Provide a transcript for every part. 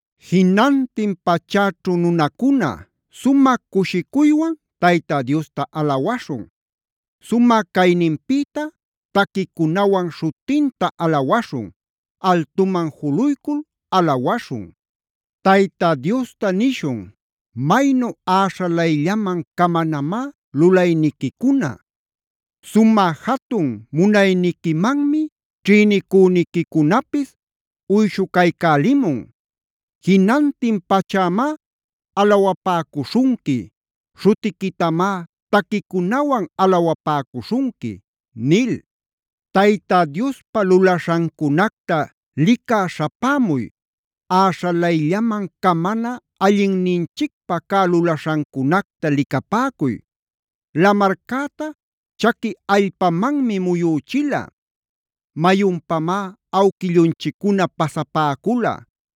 Jinantin pachäćhu nunacuna, sumä cushicuywan Tayta Diosta alawaśhun. Sumä cayninpïta taquicunawan śhutinta alawaśhun. Altuman juluycul alawaśhun. Tayta Diosta nishun: “Maynu äśhalayllaman camanamá lulayniquicuna. Sumä jatun munayniquimanmi ćhïnicüniquicunapis uyshucaycälimun. Jinantin pachämá alawapäcuśhunqui. Śhutiquitamá taquicunawan alawapäcuśhunqui” nil. Tayta Diospa lulaśhancunacta licä śhapämuy. Äśhalayllaman camana allinninchicpä cä lulaśhancunacta licapäcuy. Lamarcäta chaqui allpamanmi muyüchila.a Mayunpamá awquillunchiccuna pasapäcula.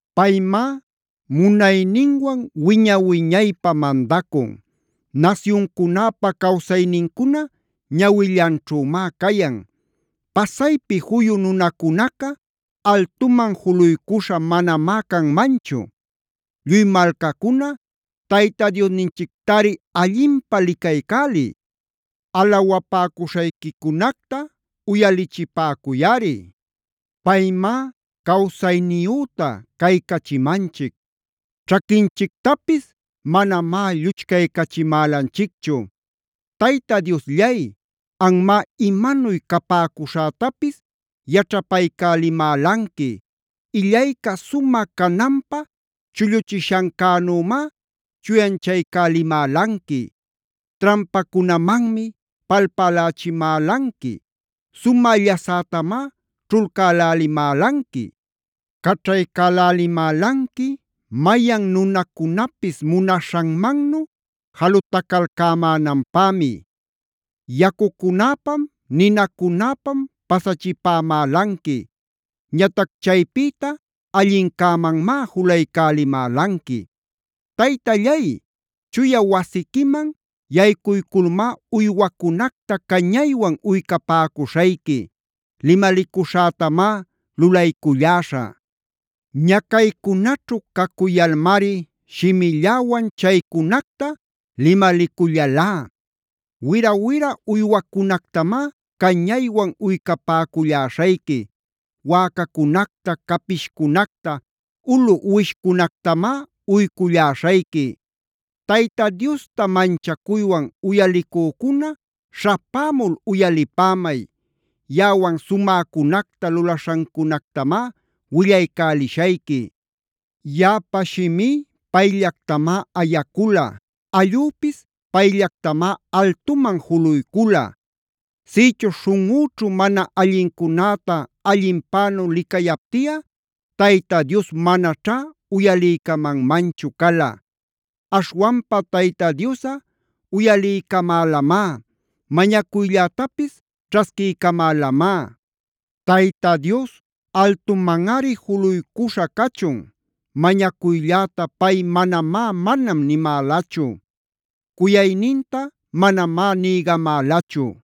Paymá munayninwan wiña-wiñaypä mandacun. Nasyuncunäpa cawsaynincuna ñawillanćhümá cayan. Pasaypi juyu nunacunaca altuman juluycuśha manamá canmanchu. Lluy malcacuna Tayta Diosninchictari allinpä licaycäliy. Alawapäcuśhayquicunacta uyalichipäcuyꞌari. Paymá cawsayniyüta caycachimanchic; ćhaquinchictapis manamá lluchcaycachimälanchicchu. Tayta Diosllay, anmá imanuy capäcuśhätapis yaćhapaycälimälanqui. Illayca sumä cananpä chulluchishancänümá chuyanchaycälimälanqui. Trampacunamanmi palpälächimälanqui. Sumä llasätamá ćhulcälälimälanqui. Caćhaycälälimälanqui mayan nunacunapis munaśhanmannu jalutacalcämänanpämi. Yacucunäpam, ninacunäpam pasachipämälanqui. Ñatac chaypïta allincämanmá julaycälimälanqui. Taytallay, chuya wasiquiman yaycuyculmá uywacunacta cañaywan uycapäcuśhayqui. Limalicuśhätamá lulayculläśhä. Ñacaycunaćhu cacuyalmari shimilläwan chaycunacta limalicullalá. Wira-wira uywacunactamá cañaywan uycapäculläśhayqui. Wäcacunacta, capishcunacta, ulu uwishcunactamá uyculläśhayqui. Tayta Diosta manchacuywan uyalicücuna śhapämul uyalipämay. Yaꞌawan sumäcunacta lulaśhancunactamá willaycälishayqui. Yaꞌapa shimí payllactamá ayacula. Allüpis payllactamá altuman juluycula. Sïchuśh śhunꞌüćhu mana allincunäta allinpänu licayaptiꞌa Tayta Dios manaćhá uyaliycamanmanchu cala. Aśhwanpa Tayta Diosꞌa uyaliycamälamá. Mañacuyllätapis ćhasquiycamälamá. Tayta Dios altumanꞌari juluycuśha cachun. Mañacuylläta pay manamá “manam” nimälachu. Cuyayninta manamá nïgamälachu.